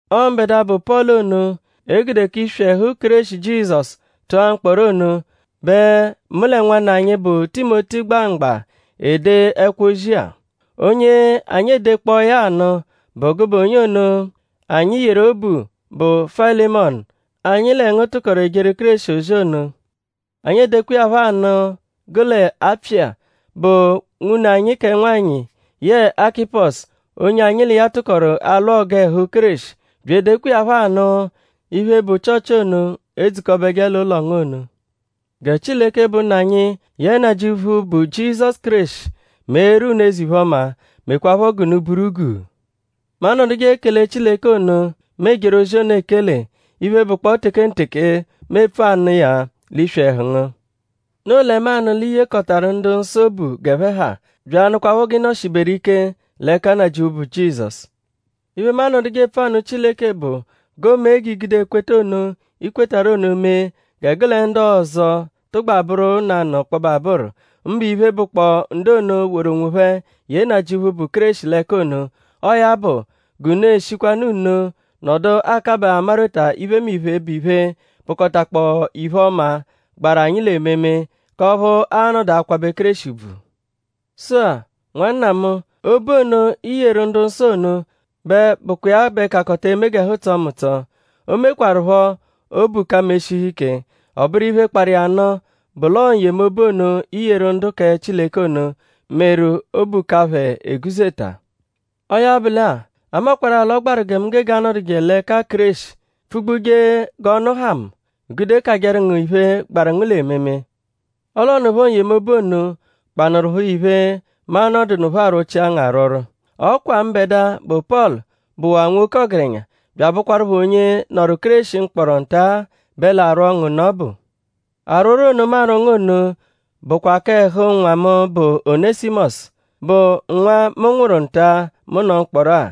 Ọo mbẹdua, bụ Pọlu ono, e gude k'iswi ẹhu Kéreshi Jizọsu tụa mkpọro ono bẹ mu lẹ nwanna anyi, bụ Timoti gba mgba ede ẹkwo-ozi-a. Onye anyi edekpọo ya anụ bụ gụbe onye ono, anyi yeru obu, bụ Fayilimọnu, anyi lẹ ngu tụkoru ejeru Kéreshi ozi ono. Anyi edekwa iya phọ anụ gụ lẹ Apfiya, bụ nwune anyi kẹ nwanyị yẹe Akịposu, onye anyi l'iya tụkoru alwụ ọgu ẹhu Kéreshi; bya edekwa iya phọ anụ iphe, bụ Chịochi ono, edzukọbeje l'ụlo ngu ono. Gẹ Chileke, bụ Nna anyi yẹe Nnajịuphu, bụ Jizọsu Kéreshi meeru unu eze-iphe-ọma; mekwaaphọ g'unu buru guu. Mu anọduje ekele Chileke ono, mu ejeru ozi ono ekele iphe, bụkpoo tekenteke, mu epfu anụ iya l'iswi ẹhu ngu. Noo lẹ mu anụ l'i yekọtaru ndu-nsọ obu g'ẹphe ha; bya anụkwapho g'ị nọ-shiberu ike l'ẹka Nnajịuphu, bụ Jizọsu. Iphe, mu anọduje epfu anụ Chileke bụ g'o mee g'i gude ekweta ono, ị kwetarụ ono mee gẹ gụ lẹ ndu ọzo tụgba bụru nanụ ọkpobe abụru; mbụ iphe, bụkpoo ndu ono, woru onwophẹ ye Nnajịuphu, bụ Kéreshi l'ẹka ono. Ọo ya bụ; g'unu eshikwanụ nno nọdu akabaa amarweta iphemiphe, bụ iphe, bụkotakpoo iphe-ọma, gbaru anyi l'ememe k'ọphu aa-nọdu akwabẹ Kéreshi ùbvù. Sụ-a; nwanna mu; obu ono, i yeru ndu-nsọ ono bẹ bụkwa iya bẹ kakọta eme g'ẹhu tsọo mu ụtso. O mekwarụpho obu ka mu eshihu ike. Ọ bụru iphe, kparụ iya nụ bụ l'ọo n-yemobu ono, i yeru ndu kẹ Chileke ono meru obu ka phẹ eguzeta. Ọo ya bụ lẹ-a; a makwarụ-a l'ọ gbaru gẹ mu gege anọduje l'ẹka Kéreshi pfugbuje g'ọnu ha mu; gude kajẹru ngu iphe, gbaru ngu l'ememe; ọle ọ nụpho n-yemobu ono kpanụrupho iphe, mu a-nọdunupho arwọchia ngu arwọrwo. Ọ kwa mbẹdua, bụ Pọlu, bụwaa nwoke ọgerenya bya abụkwarupho onye nọru Kéreshi mkpọro nta-a bẹ l'arwọ ngu nụ ọbu. Arwọrwo ono, mu arwọ ngu ono bụkwa kẹ ẹhu nwa mu, bụ Onẹsimosu; bụ nwa mu nwụru nta-a, mu nọ mkpọro-a.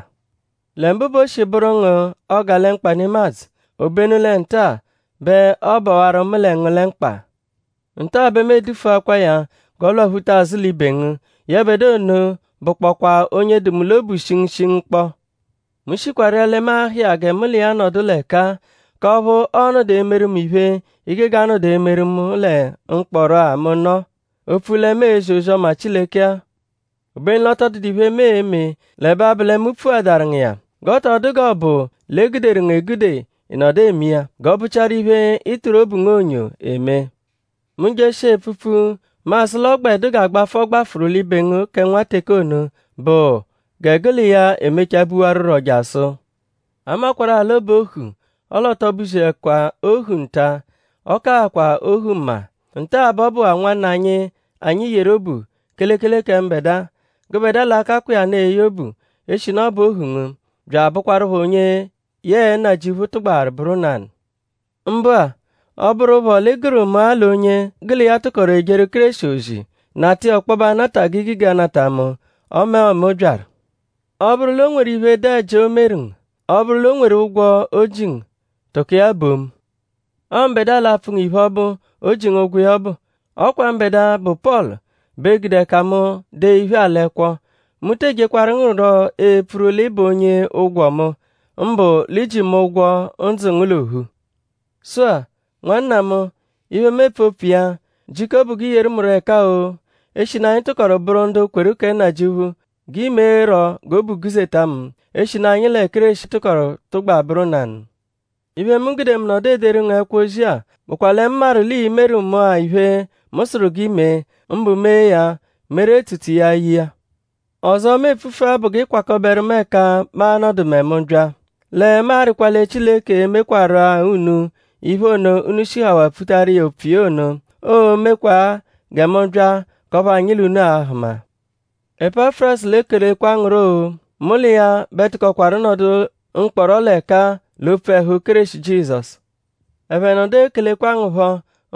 Lẹ mbụ bẹ o shi bụru ngu 'ọgalemkpa nemadzụ; obenu lẹ nta-a bẹ ọobawaru mu lẹ ngu lẹ mkpa. Nta-a bẹ mu edufuakwaa ya g'ọ lwaphuta azụ l'ibe ngu. Yẹbedua ono bụkpokwa onye dụ mu l'obu shingushingu kpọ. Mu shikwa rịa lẹ mu a-ha iya gẹ mu l'iya nọdu l'ẹka-a k'ọphu ọo-nọdu emeru mu iphe, i gege anọdu emeru mu lẹ mkpọro-a, mu nọ; opfu lẹ mu ezi ozi-ọma Chileke-a. Obenu l'ọ tọ dụdu iphe, mu eme l'ẹbe abụ lẹ mu pfuadaru ngu iya; g'ọ tọ dụ g'ọ bụ l'e guderu ngu egude ị nọdu eme iya. G'ọ bụchiaru iphe, ị tụru obu ngu onyo eme. Mu -jeshia epfupfu; mu asụ l'ọ gbẹ dụ g'agbafụ, ọ gbafụru l'ibe ngu kẹ nwa teke ono bụ gẹ gụ l'iya emechaa buwarurọ jasụ. A makwarụ-a l'ọ bụ ohu; ọle ọ tọ buziẹkwa ohu nta-a; ọ kaakwa ohu mma. Nta-a bẹ ọ bụwaa nwanna anyi, anyi yeru obu; kelekele kẹ mbẹdua. Gụbedua l'a-kakwa iya nụ eye obu; eshinu ọ bụ ohu ngu; bya abụkwarupho onye yẹe Nnajịuphu tụgbawaru bụru nanụ. Mbụ-a; ọ -bụrupho l'ị gụru mu-a l'onye gụ l'iya tụkoru ejeru Kéreshi ozi; nata iya ọkpobe anata g'i gege anata mu ọme ọo mu byaru. Ọ -bụru l'o nweru iphe, dụ ẹji, o meru ngu; ọ -bụ l'o nweru ụgwo, o ji ngu; tụko iya bo mu. Ọo mbẹdua l'a-pfụ ngu iphe ọbu, o ji ngu ụgwo iya ọbu. Ọ kwa mbẹdua, bụ Pọlu bẹ gude ẹka mu dee iphe-a l'ẹkwo. Mu te ejekwaru ngu rọ epfuru l'ị bụ onye ụgwo mu; mbụ l'i ji mu ụgwo ndzụ ngu l'ophu. Sụ-a; nwanna mu; iphe, mu epfu opfu iya; jiko bụ g'i yeru mu ẹka-o; eshinu anyi tụkoru bụru ndu kweru kẹ Nnajịuphu; g'i meerọ g'obu guzeta mu; eshinu anyi lẹ Kéreshi tụkoru tụgba bụru nanụ. Iphe, mu gude mu nọdu ederu ngu ẹkwo-ozi-a bụkwa lẹ mu maru l'ii-meru mu-a iphe, mu sụru g'i mee; mbụ mee ya meru etsutsu iya ye iya. Ọzo, mu e-pfufu-a bụ g'ị kwakọberu mu ẹka mu a-nọdu mẹ mu -bya. Lẹ mu arịkwa lẹ Chileke e-mekwarụ-a unu iphe ono, unu shihawaa pfutaru iya opfu iya ono; oo-mekwaa gẹ mu bya k'ọphu anyi l'unu a-hụma. Epafurasu l'ekelekwa ngu rọ-o. Mu l'iya bẹ tụkokwaru nọdu mkpọro l'ẹka-a l'opfu ẹhu Kéreshi Jizọsu. Ẹphe nọdu ekelekwa ngu phọ;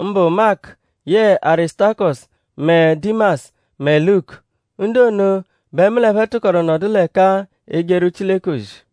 mbụ Maku yẹe Arisutakọsu mẹ Dimasu mẹ Luku. Ndu ono bẹ mu l'ẹphe tụkoru nọdu l'ẹka-a ejeru Chileke ozi.